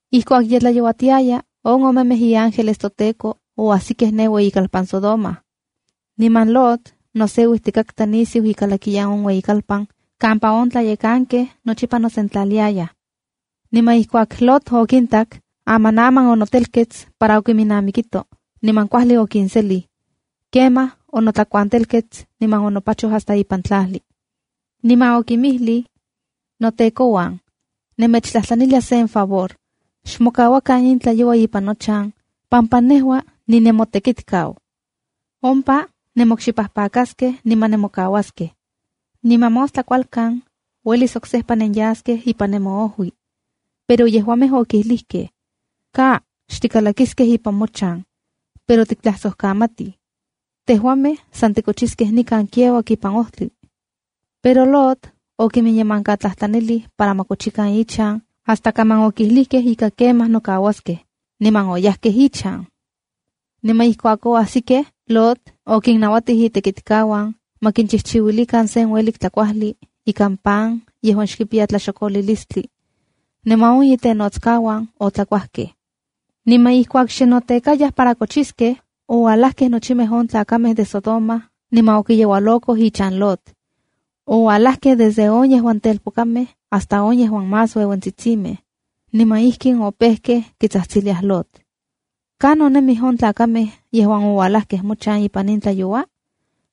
Ijkuak ye tlayouatitiaya, on omemej iángeles toTEKO oajsikej ne ueyikalpan Sodoma. Niman Lot noseuijtikatka nisiu ikalakiyan on ueyikalpan kampa on tlayekankej nochipa nosentlaliaj. Niman ijkuak Lot okintak, amanaman onotelkets para okinnamikito, niman kuajli okinselij. Kemaj onotlakuantelkets niman onopachoj hasta ipan tlajli, niman okinmijlij: —Notekouan, nemechtlajtlanilia sen favor, xmokauakan in tlayoua ipan nochan pampa nejua ninemotekitkau. Ompa nenmokxipajpakaskej niman nemokauaskej. Niman mostla kualkan uelis oksejpa nenyaskej ipan nemoojui. Pero yejuamej okijlijkej: —¡Ka! Xtikalakiskej ipan mochan, pero tiktlajsojkamatij. Tejuamej san tikochiskej nikan kiauak ipan ojtli. Pero Lot okiminyemankatlajtlanilij para ma kochikan ichan hasta kaman okijlijkej ika kemaj nokauaskej, niman oyajkej ichan. Niman ijkuak oajsikej, Lot okinnauatij itekitkauan ma kinchijchiuilikan sen uelik tlakuajli ikan pan yejuan xkipiya tlaxokolilistli. Niman on itenotskauan otlakuajkej. Niman ijkuak xe notekayaj para kochiskej, ouajlajkej nochimej on tlakamej de Sodoma niman okiyeualokoj ichan Lot. Ouajlajkej desde on yejuan telpokamej hasta on yejuan más ueuentsitsimej, niman ijkin opejkej kitsajtsiliaj Lot: —¿Kanon nemij on tlakamej yejuan ouajlajkej mochan ipan in tlayoua?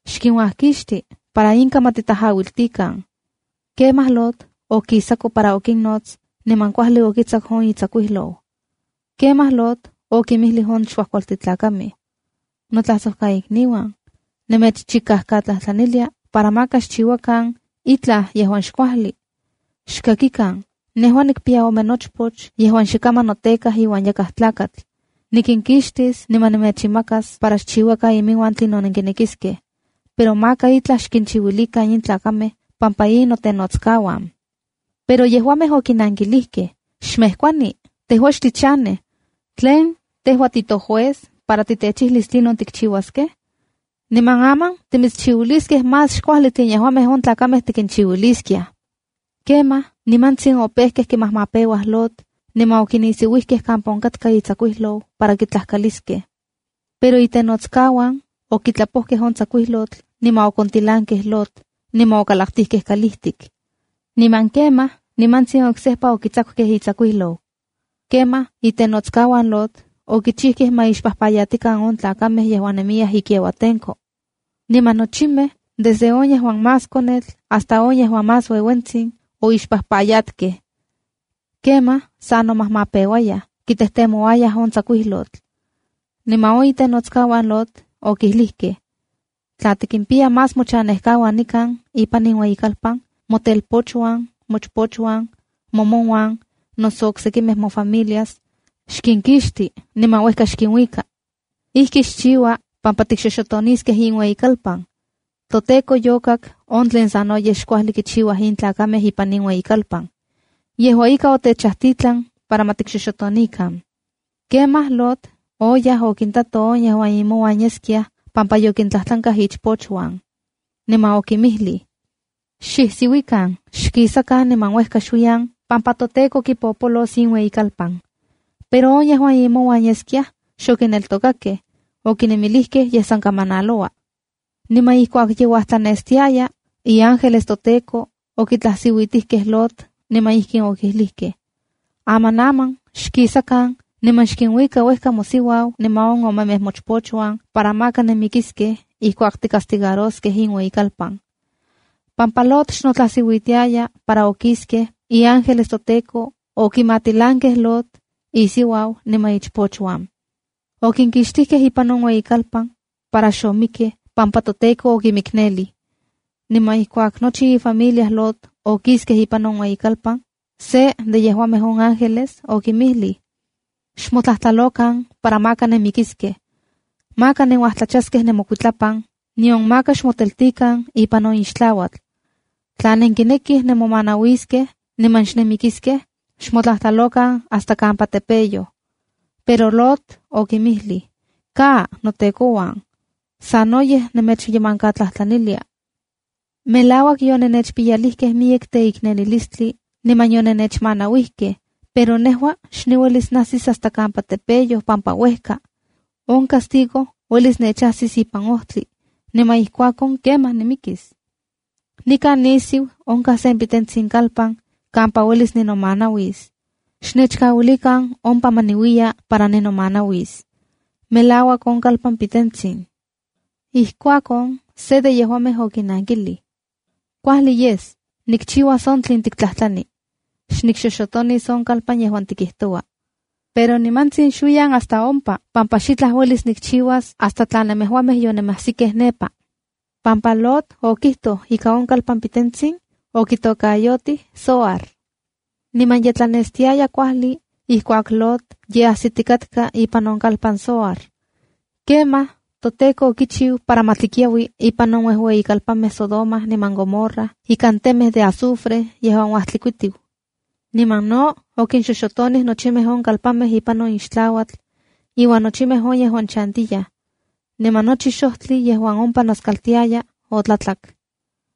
¡Xkinuajkixti para inka ma titajauiltikan! Kemaj Lot okisako para okinnots, niman kuajli okitsaku on itsakuijlou. Kemaj Lot okinmijlij on xkuajkualtin tlakamej: —Notlajsojkaikniuan, nemechchikajkatlajtlanilia para maka xchiuakan itlaj yejuan xkuajli. Xkakikan, nejua nikpiya ome nochpoch yejuan xe kaman notekaj iuan yakaj tlakatl. Nikinkixtis niman nemechinmakas para xchiuakan iminuan tlinon nenkinekiskej. Pero maka itlaj xkinchiuilikan in tlakamej pampa in notenotskauana. Pero yejuamej okinankilijkej: —¡Xmejkuani, tejua xtichanej! ¿Tlen tejua titojuez, para titechijlis tlinon tikchiuaskej? ¡Aman timitschiuiliskej más xkuajli xken yejuamej on tlakamej nenkichiuiliskiaj! Kemaj, nimantsin opejkej kimajmapeuaj Lot, niman ononisiuijkej kampa onkatka itsakuijlou para kitlajkaliskej. Pero itenotskauan okitlapojkej on tsakuijlotl niman okontilankej Lot, niman okalaktijkej kalijtik. Niman kemaj nimantsin oksejpa okitsakukej itsakuijlou. Kemaj itenotskauan Lot, okichijkej ma ixpajpayatikan on tlakamej yejuan nemiyaj kiauatenko. Niman nochimej desde on yejuan más konetl hasta on yejuan más ueuentsin, oixpajpayatkej. Kemaj sa nomajmapeuayaj kitejtemouayaj on tsakuijlotl. Niman on itenotskauan Lot okilijkej: —Tla tikimpiya más mochanejkauan nikan ipan in ueyikalpan, motelpochuan, mochpochuan, momonuan noso oksekimej mofamilias, xkinkixti niman uejka xkinuika. Ijki xchiua pampa tikxoxotoniskej in ueyikalpan. ToTEKO yokak on tlen sanoyej xkuajli kichiuaj in tlakamej ipan in ueyikalpan. Yejua ika, otechajtitlan para ma tikxoxotonikan. Kemaj Lot oyaj okintato on yejuan imonuan yeskiaj pampa yokintlajtlankaj ichpochuan. Niman okinmijlij: —¡Xijsiuikan, xkisakan niman uejka xuiyan pampa toTEKO kipopolos in ueyikalpan! Pero on yejuan imonuan yeskiaj, xokineltokakej. Okinemilijkej yej san kamanaloua. Niman ijkuak ye uajtlanestiaya, iángeles toTEKO okitlajsiuitijkej Lot, niman ijkin okilijkej: —Amanaman, xkisakan niman xkinuika uejka mosiuau niman on omemej mochpochuan para maka nenmikiskej ijkuak tikcastigaraskej in ueyikalpan. Pampa Lot xnotlajsiuitiayaj para kisaskej, iángeles toTEKO okimatilankej Lot, isiuau niman ichpochuan. Okinkixtijkej ipan on ueyikalpan para xomikkej, pampa toTEKO okimiknelij. Niman ijkuak nochi ifamilia Lot okiskej ipan on ueyikalpan, se de yejuamej on ángeles okinmijlij: —¡Xmotlajtlalokan para maka nenmikiskej! Maka nenuajtlachaskej nemokuitlapan, nion maka xmoteltikan ipan on ixtlauatl. Tla nenkinekij nemomanauiskej niman xnenmikiskej, xmotlajtlalokan hasta kampa tepeyoj. Pero Lot okinmijlij: —¡Ka, notekouan! ¡Sanoyej nemechyemankatlajtlanilia! Melauak yonennechpiyalijkej miyek teiknelilistli niman onennechmanauijkej, pero nejua xniuelis najsis hasta kampa tepeyoj pampa uejka. On castigo uelis nechajsis ipan ojtli, niman ijkuakon, kemaj, nimikis. Nikan nisiu onkaj sen pitentsin kalpan kampa uelis ninomanauis. ¡Xnechkauilikan ompa ma niuiya para ninomanauis. Melauak on kalpan pitentsin! Ijkuakon se de yejuamej okinankilij: —Kuajli yes, nikchiuas on tlen tiktlajtlani. Xnikxoxotonis on kalpan yejuan tikijtoua. Pero nimantsin xuiyan hasta ompa, pampa xitlaj uelis nikchiuas hasta tla nemejuamej yonemajsikej nepa. Pampa Lot okijtoj ika on kalpan pitentsin, okitokayotijkej Zoarb. Niman ye tlanestiaya kuajli, ijkuak Lot ye ajsitikatka ipan on kalpan Zoar. Kemaj toTEKO okichiu para ma tlikiaui ipan on uejueyimej kalpanmej Sodoma niman Gomorra ikan temej de azufre yejuan uajtlikuitiu. Niman no okinxoxotontikej nochimej on kalpanmej ipan on ixtlauatl iuan nochimej yejuan ompa chantiyaj, niman nochi xojtli yejuan ompa noskaltiaya otlatlak.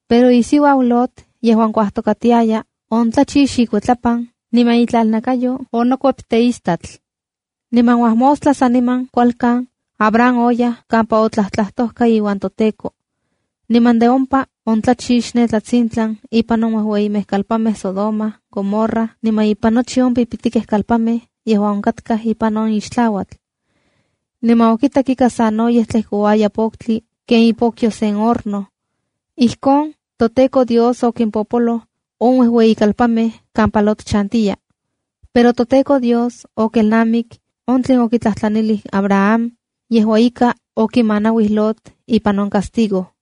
Pero isiuau Lot yejuan kuajtokatiaya, oontlachix ikuitlapan. Niman itlalnakayo onokuep teistatl. Niman uajmostla saniman kualkan, Abraham oyaj kampa otlajtlajtojka iuan toTEKO. Niman de ompa ontlachix ne tlatsintlan ipan on uejueyimej kalpanmej Sodoma, Gomorra niman ipan nochi on pipitikej kalpanmej yejuan onkatkaj ipan on ixtlauatl. Niman okitak ika sanoyej tlejkouaya poktli ken ipokyo sen horno. Ijkon toTEKO Dios okimpopoloj on uejueyimej kalpanmej kampa Lot chantiya. Pero toTEKO Dios okelnamik on tlin okitlajtlanilij Abraham, yejua ika okimanauij Lot ipan on castigo.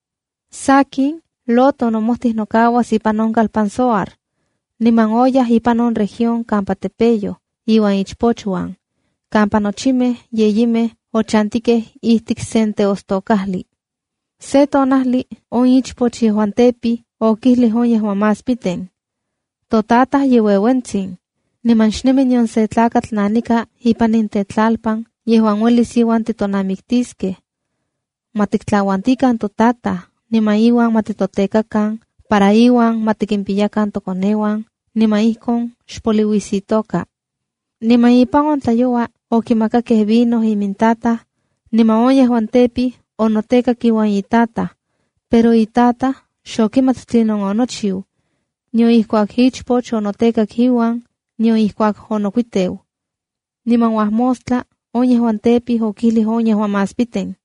Sakin, Lot onomojtij nokauas ipan on kalpan Zoar, niman oyaj ipan on región kampa tepeyoj iuan ichpochuan, kampa nochimej yeyimej ochantikej ijtik sen teostokajli. Se tonajli on ichpoch yejuan tepij okijlij on yejuan más piten: —Totataj ye ueuentsin, niman xnemi nion se tlakatl nanika ipan in tetlalpan yejuan uelis iuan titonamiktiskej. Ma tiktlauantikan totataj niman iuan ma titotekakan para iuan ma tikimpiyakan tokoneuan niman ijkon xpoliuis itoka. Niman ipan on tlayoua okimakakej vino imintataj, niman on yejuan tepij onotekak iuan itataj. Pero itataj xokimat tlinon onochiu, nion ijkuak ichpoch onotekak iuan, nion ijkuak onokuiteu. Niman uajmostla on yejuan tepij, okijlij on más piten: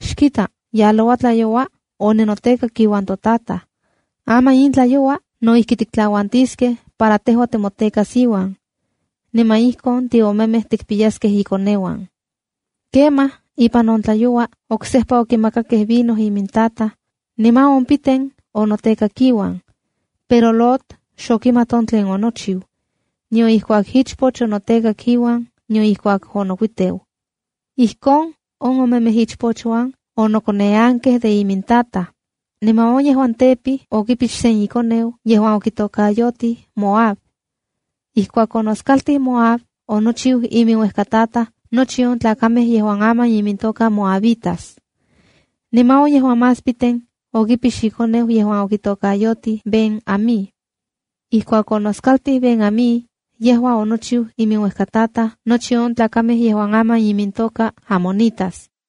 —Xkita, yaloua tlayoua oninotekak iuan totataj. Aman in tlayoua, no ijki tiktlauantiskej para tejua timotekas iuan. Niman ijkon tiomemej tikpiyaskej ikoneuan. Kemaj ipan on tlayoua oksejpa okimakakej vino imintataj, niman on piten onotekak iuan. Pero Lot xokimat on tlen onochiu, nion ijkuak ichpoch onotekak iuan, nion ijkuak onokuiteu. Ijkon on omemej ichpochuan onokoneankej de imintataj. Niman on yejuan tepij okipix sen ikoneu yejuan okitokayotij Moab. Ijkuak onoskaltij Moab, onochiu iminuejkataj nochi on tlakamej yejuan aman imintoka moabitas. Niman on yejuan más piten okipix ikoneu yejuan okitokayotij Ben-amí. Ijkuak onoskaltij Ben-amí, yejua onochiu iminuejkataj nochi on tlakamej yejuan aman imintoka amonitas.